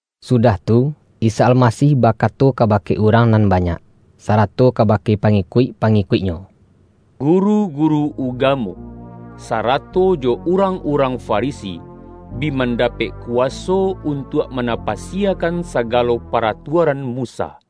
Sudah tu, Isa Almasih bakato kabake urang nan banyak, sa-rato kabake pangikuik-pangikuik-Nyo, ”Guru-guru ugamo, sarato jo urang-urang Farisi, bi mandapek kuwaso un-tuak manapasiekan sagalo paratuaran Musa.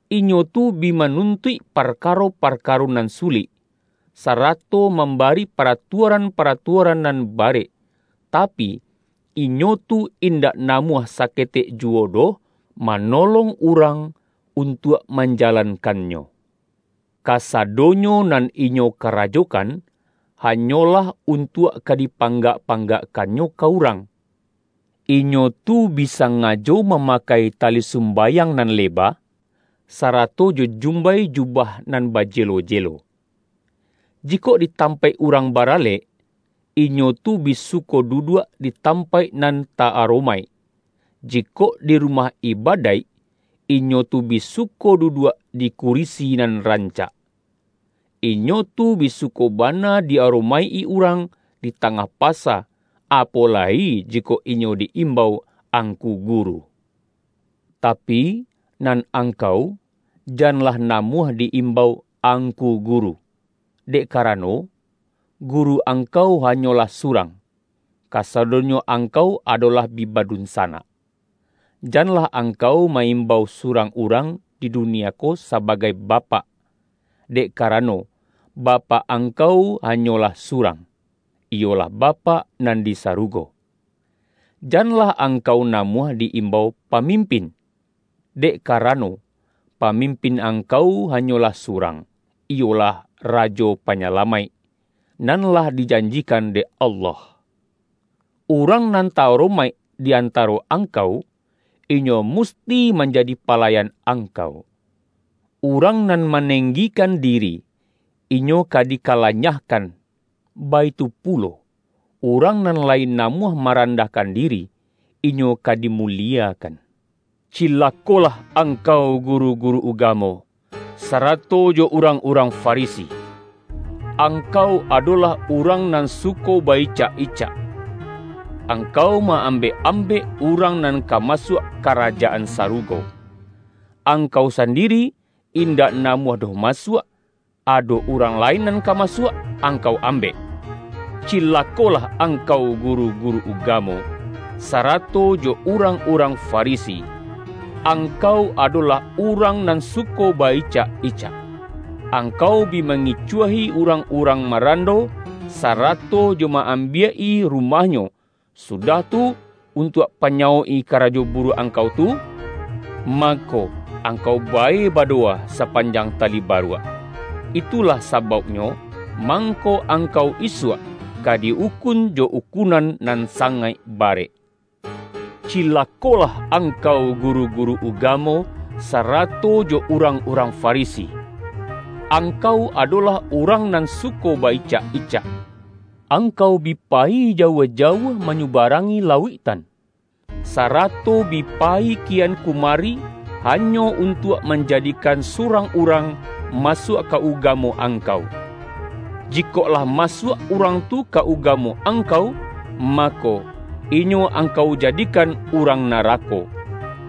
Inyo tu bi manuntuik parkaro-par-karo nan sulik, sarato mambari pa-ratuaran-paratuaran nan barek, tapi, inyo tu indak namuah saketek juwo doh manolong urang, untuak manja-lankannyo. Kasadonyo nan inyo ka-rajokan, hanyolah untuak ka dipang-gak-panggakkannyo ka urang. Inyo tu bi sangajo mamakai tali sumba-yang nan leba, sarato jo jumbai ju-bah nan bajelo-jelo! Jikok di tam-paik urang baralek, inyo tu bi suko duduak di tampaik nan ta-aromaik, jikok di rumah ibadaik, inyo tu bi su-ko duduak di kurisi nan rancak. Inyo tu bi suko bana di aromaik-i urang di tangah pasa, apo lai jikok inyo di-im-bau ’Angku guru'. Tapi, nan angkau, janlah namuah di-imbau ’Angku gu-ru’, dek karano, Guru angkau hanyo-lah Surang, kasadonyo angkau adolah bi badunsanak. Janlah angkau ma-imbau surang urang di dunie ko sa-bagai ’Bapak’, dek karano Bapak ang-kau hanyolah surang, iyolah Bapak nan di sarugo. Janlah angkau na-muah di-imbau ’Pamimpin’, dek karano, Pamimpin angkau hanyolah surang, iyolah Rajo Panyalamaik, nan lah di-janjikan dek Allah. Urang nan ta-aromaik di antaro angkau, inyo mus-ti manjadi palayan angkau. Urang nan manenggikan diri, inyo ka dika-lanyahkan, baitu pulo, urang nan lai namuah marandahkan diri, inyo ka dimuliekan.” ”Cilakolah angkau guru-guru uga-mo, sarato jo urang-urang Farisi! Ang-kau adolah urang nan suko ba-icak-icak. Angkau ma-ambek-ambek urang nan ka masuak Karajaan Sarugo. Ang-kau sandiri indak namuah doh ma-suak, ado urang lain nan ka masuak, angkau ambek. Cilakolah angkau guru-guru ugamo, sarato jo urang-urang Fari-si: Angkau adolah urang nan suko ba-icak-icak. Angkau bi mangicuahi urang-urang marando, sarato jo ma-ambiak-i rumahnyo, sudah tu, untuak panyawok-i karajo buruak angkau tu, mako angkau bae badowa sapanjang tali baruak. Itulah sabauknyo, mang-ko angkau isuak, ka di-ukun jo ukun-an nan sangaik barek!] Cilakolah angkau guru-guru uga-mo, sarato jo urang-urang Farisi! Ang-kau adolah urang nan suko ba-icak-icak! Angkau bi payi jauah-jauah manyubarangi lauiktan, sarato bi pa-yi kian kumari, hanyo untuak manja-dikan surang urang masuak ka uga-mo angkau. Jikok lah masuak urang tu ka ugamo angkau, mako, inyo ang-kau jadikan urang narako,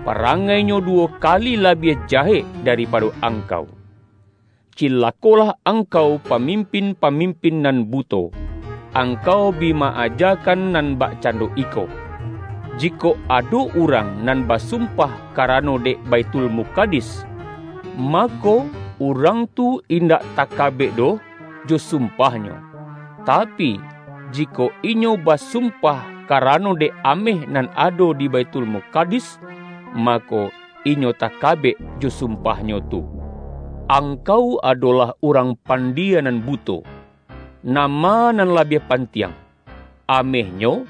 parangai-nyo duwo kali labiah jahek daripado angkau! Cilakolah angkau pamimpin-pa-mimpin nan buto! Angkau bi ma-aja-kan nan bakcando iko, ’Jikok ado urang nan basumpah karano dek Baithul-mukadis, mako, urang tu indak ta-kabek doh jo sumpahnyo; tapi, jikok inyo basumpah karano dek ameh nan ado di Baithulmukadis, mako, inyo takabek jo sumpahnyo tu.’ Angkau adolah urang pandie nan buto! Nama nan labiah pantiang: amehnyo,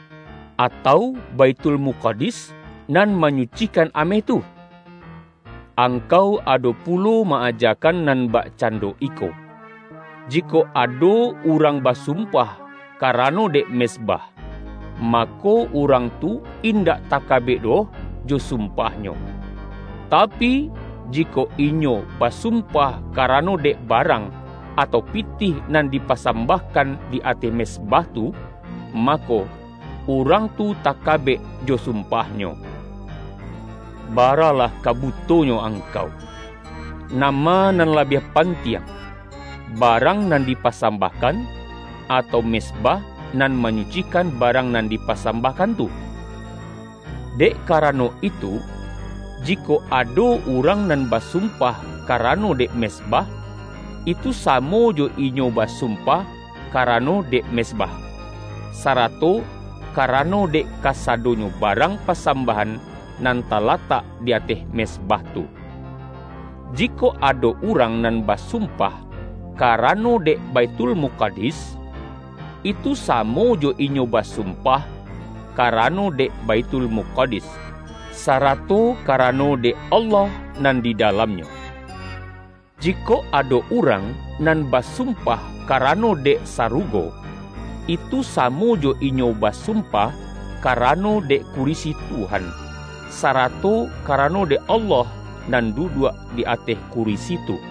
atau Baithulmukadis nan manyucikan ameh tu? Angkau ado pulo ma-ajakan nan bakcando iko, ’Jikok ado urang basum-pah karano dek mezbah, mako urang tu indak takabek doh jo sumpahnyo; tapi, jikok inyo basumpah karano dek barang, atau pitih nan dipasambah-kan di ateh mezbah tu, mako, urang tu takabek jo sumpahnyo.’ Baralah ka butonyo angkau! Nama nan labiah pantiang? Barang nan dipasambahkan, atau mezbah nan manyucikan barang nan dipasambahkan tu? Dek kara-no itu, jikok ado urang nan basumpah karano dek mezbah, itu samo jo inyo basumpah karano dek mezbah, sara-to karano dek kasadonyo barang pa-sambahan, nan talatak di ateh mezbah tu. Jikok ado urang nan basumpah karano dek Baithulmukadis, itu samo jo inyo basumpah karano dek Baithul-mukadis, sarato karano dek Allah nan di dalamnyo. Jikok ado urang nan basumpah karano dek sarugo, itu sa-mo jo inyo basumpah karano dek ku-risi Tuhan, sarato karano dek Allah nan duduak di ateh kurisi tu.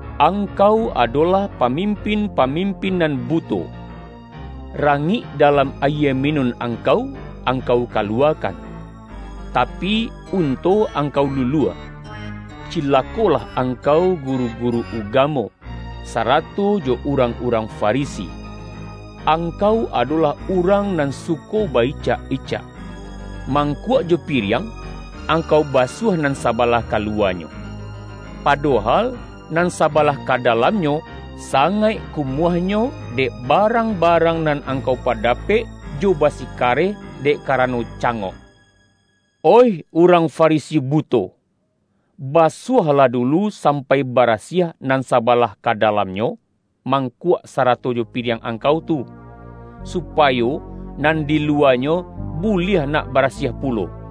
Angkau adolah pamimpin-pa-mimpin nan buto! Rangik dalam ayie minun angkau, angkau kaluwakan, ta-pi, unto angkau lulua! Cilakolah angkau guru-guru uga-mo, sarato jo urang-urang Farisi! Ang-kau adolah urang nan suko ba-icak-icak! Mangkuak jo piriang, angkau basuah nan sabalah kaluwanyo, pado-hal nan sabalah ka dalamnyo, sangaik kumuahnyo, dek barang-barang nan angkau padapek, jo basikareh dek ka-rano cangok. Oih urang Farisi buto! Basuahlah dulu sampai barasiah nan sabalah ka dalamnyo, mangkuak sara-to jo piriang angkau tu, supayo nan di-luwanyo buliah nak barasiah pulo!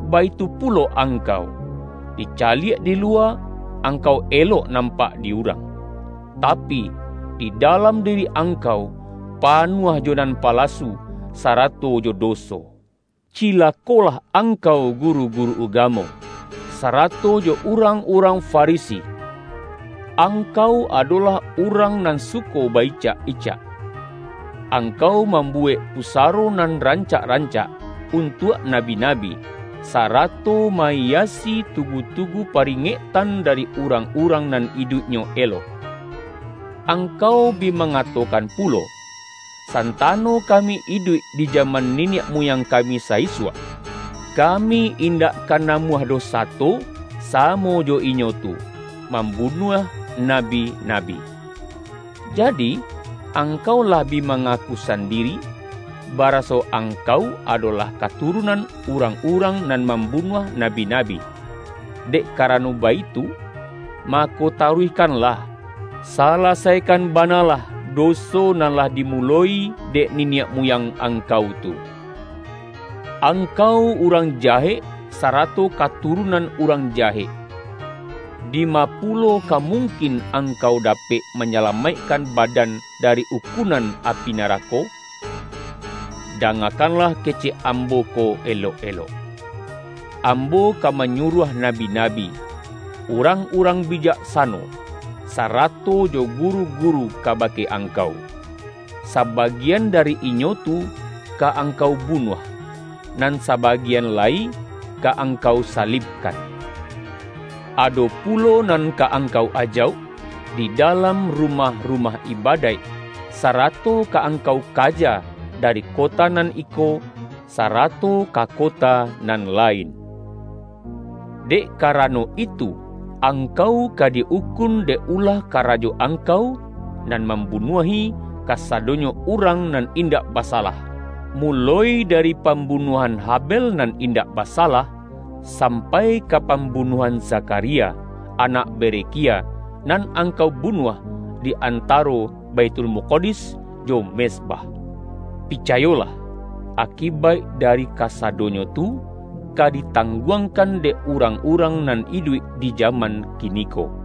Baitu pulo angkau. Dicaliak di luwa angkau elok nampak di urang; tapi, di dalam diri angkau panuah jo nan palasu, sa-rato jo doso.” ”Cilakolah angkau guru-guru ugamo, sarato jo urang-urang Fari-si! Angkau adolah urang nan suko ba-icak-icak! Angkau mambuwek pu-saro nan rancak-rancak, untuak na-bi-nabi, sarato ma-iyasi tugu-tugu paringektan dari urang-urang nan iduiknyo elok. Angkau bi manga-tokan pulo, ’Santano kami iduik di jaman niniak muyang kami sa-isuak, kami indak ka namuah doh sato sa-mo jo inyo tu, mambunuah nabi-na-bi.’ Jadi, angkau lah bi mangaku sandiri, baraso angkau adolah ka-turunan urang-urang nan mambu-nuah nabi-nabi! Dek karano baitu, mako taruihkanlah, salasaikan ba-nalah doso nan lah dimuloi dek ni-niak muyang angkau tu! Angkau urang jahek, sarato katurunan urang jahek! Dima pulo kamungkin angkau dapek manyalamaikkan badan dari ukunan api narako? Dangakanlah kecek Ambo ko elok-elok: Ambo ka manyuruah nabi-nabi, urang-urang bijaksano, sarato jo guru-guru kaba-ke angkau; sabagian dari inyo tu ka angkau bunuah, nan sabagian lai ka angkau salibkan. Ado pulo nan ka angkau ajauk di dalam rumah-ru-mah ibadaik, sarato ka angkau ka-ja dari kota nan iko, sarato ka kota nan lain. Dek karano itu angkau ka di-ukun, dek ulah karajo angkau, nan mambunuahi kasadonyo urang nan indak basalah muloi dari pam-bunuahan Habel nan indak basalah, sampai ka pambunuahan Zakharia anak Berekia, nan angkau bunuah di antaro Baithulmukadis jo mezbah. Picayolah: akibaik dari kasadonyo tu ka ditangguangkan dek urang-urang nan iduik di jaman kiniko!”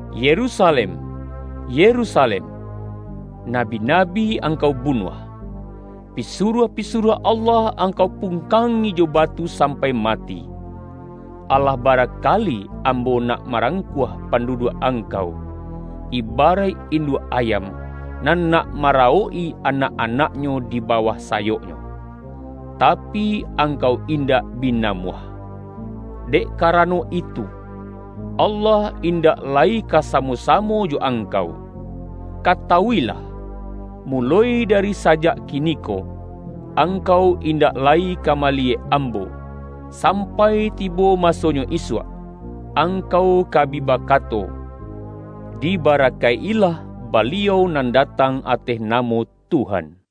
”Yerusalem, Yerusalem! Nabi-nabi angkau bunuah. Pisuruah-pi-suruah Allah angkau pungkangi jo batu sampai mati. Alah bara kali Ambo nak marangkuah panduduak angkau, ibaraik induak ayam, nan nak marawok-i anak-anaknyo di ba-wah sayoknyo, tapi, angkau indak bi namuah! Dek karano itu, Allah indak lai ka samo-samo jo angkau. Katawuilah: Muloi dari sajak ki-niko, angkau indak lai ka maliyek Ambo, sampai tibo masonyo isuak, angkau ka bi bakato, ’Dibarakaik-ilah Baliau nan datang ateh namo Tuhan.’”